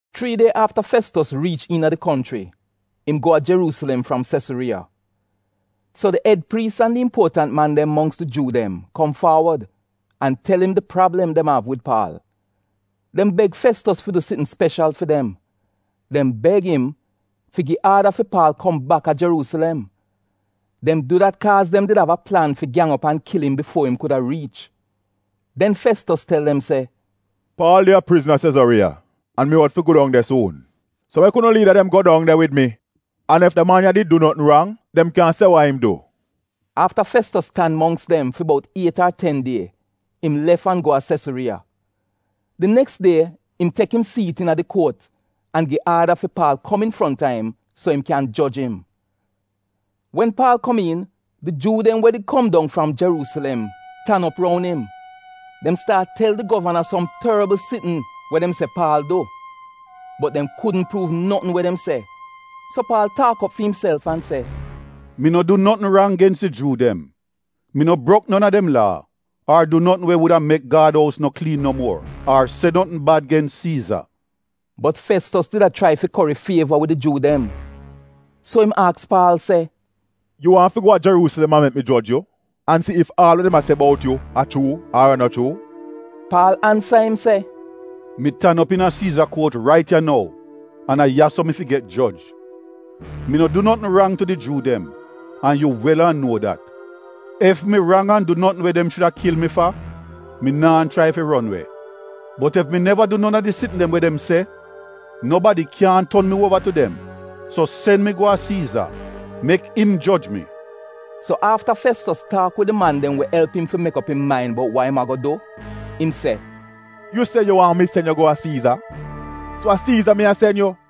Chrii die afta Festos riich iina di konchri, im go a Jeruusilem fram Sesuriiya. So di ed priis an di impuotant man dem mongks di Juu dem kom faawod an tel im di prablem dem av wid Paal. Dem beg Festos fi du sitn speshal fi dem. Dem beg im fi gi aada fi Paal kom bak a Jeruusilem. Dem du dat kaaz dem did a plan fi gyang op an kil im bifuo im kuda riich. Den Festos tel dem se, “Paal de a prizn a Sesuriiya an mi out fi go dong de suun. So mek unu liida dem go dong de wid mi an ef da man ya did du notn rang, dem kyan se wa im du.” Afta Festos tan mongks dem fi bout iet ar ten die im lef an go a Sesuriiya. Di neks die im tek im siit iina di kuot an gi aada fi Paal kom infronta im so im kyan joj im. Wen Paal kom iin, di Juu dem we did kom dong fram Jeruusilem tan op roun im. Dem staat tel di govana som torbl sitn we dem se Paal du. Bot dem kudn pruuv notn we dem se. So Paal taak op fi imself an se, “Mi no du notn rang gens di Juu dem, mi no brok non a dem Laa, ar du notn we wuda mek Gad ous no kliin no muor, ar se notn bad gens Siiza.” Bot Festos did a chrai fi kori fieva wid di Juu dem, so im aks Paal se, “Yu waahn fi go a Jeruusilem an mek mi joj yu an si ef aal wa dem a se bout yu a chuu ar a no chuu?” Paal ansa im se, “Mi tan op iina Siiza kuot rait ya nou an a ya-so mi fi get joj. Mi no du notn rang tu di Juu dem, an yu wel an nuo dat. Ef mi rang an du notn we dem shuda kil mi fa, mi naa chrai fi ron we. Bot ef mi neva du non a di sitn dem we dem se, nobadi kyaahn ton mi uova tu dem. So sen mi go a Siiza, mek im joj mi.” So afta Festos taak wid di man dem we elp im fi mek op im main bout wa im ago du, im se, “Yu se yu waahn mi sen yu go a Siiza, so a Siiza mi a sen yu!”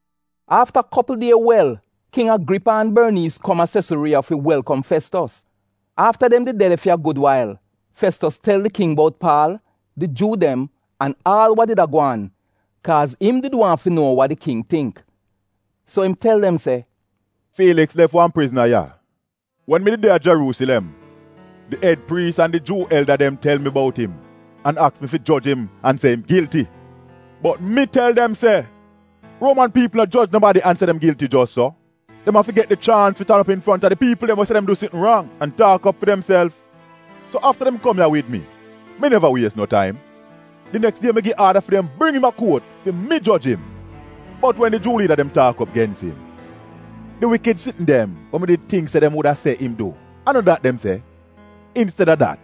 Afta kopl die wel, King Agripa an Borniis kom a Sesuriiya fi welkom Festos. Afta dem did de de fi a gud wail, Festos tel di King bout Paal, di Juu dem, an aal wa did a gwaan, kaaz im did waahn fi nuo wa di King tingk. So im tel im se, “Fiiliks lef wan prizna ya. Wen mi did de a Jeruusilem, di ed priis an di Juu elda dem tel mi bout im, an aks mi fi joj im an se im gilti. “Bot mi tel dem se Ruoman piipl no joj nobadi an se dem gilti jos so. Dem av fi get di chaans fi tan op infronta di piipl dem we se dem du sitn rang, an taak op fi demself. So afta dem kom ya wid mi, mi neva wies no taim. Di neks die mi gi aada fi dem bring im a kuot fi mi joj im. Bot wen di Juu liida dem taak op gens im, di wikid sitn dem we mi did tingk se dem wuda se im du a no dat dem se. Insteda dat,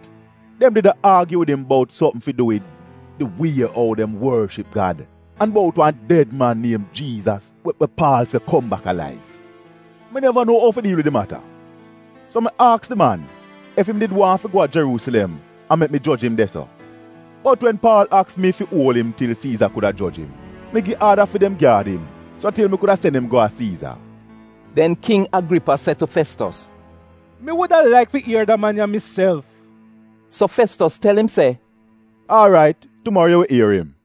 dem did a aagyu wid im bout sopm fi du wid di wie ou dem worship Gad an bout wan ded man niem Jiizas we Paal se kom bak alaiv. Mi neva nuo ou fi diil wid di mata, so mi aks di man ef im did waahn fi go a Jeruusilem an mek mi joj im de-so. Bot wen Paal aks mi fi uol im til Siiza kuda joj im, mi gi aada fi dem gyaad im so til mi kuda sen im go a Siiza.” Den King Agripa se tu Festos, “Mi wuda laik fi ier da man ya miself.” So Festos tel im se, “Aarait, tumaro yu wi ier im.”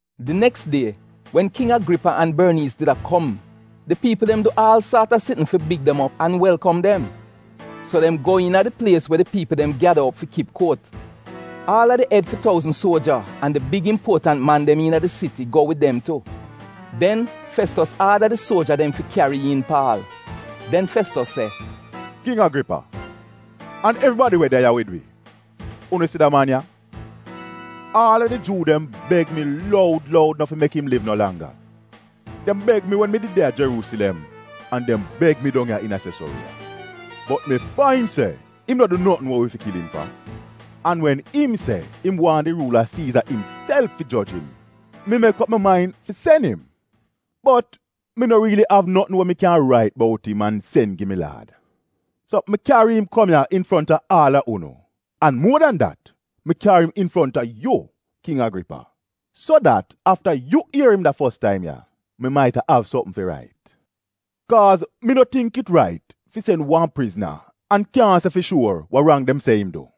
Di neks die wen King Agripa an Borniis did a kom di piipl dem du aal saat a sitn fi big dem op an welkom dem. So dem go iina di plies we di piipl dem gyada op fi kip kuot. Aal a di ed fi touzn suoja an di big impuotant man dem iina di siti go wid dem tu. Den Festos aada di suoja dem fi kyari iin Paal. Den Festos se, “King Agripa, an evribadi we de ya wid wi, unu si da man ya, aal a di Juu dem beg mi loud loud no fi mek im liv no langga. Dem beg mi wen mi did de a Jeruusilem an dem beg mi dong ya iina Sesuriiya. Bot mi fain se im no du notn we wi fi kil im fa, an wen im se im waahn di Ruula Siiza imself fi joj im, mi mek op mi main fi sen im. Bot mi no riili av notn we mi kyan rait bout im an sen gi mi Laad. So mi kyari im kom ya infronta aal a unu, an muo dan dat mi kyari im infronta yu, King Agripa, so dat afta yu ier im da fos taim ya, mi maita av sopm fi rait. Kaaz mi no tingk it rait fi sen wan prizna an kyaahn se fi shuor wa rang dem se im du.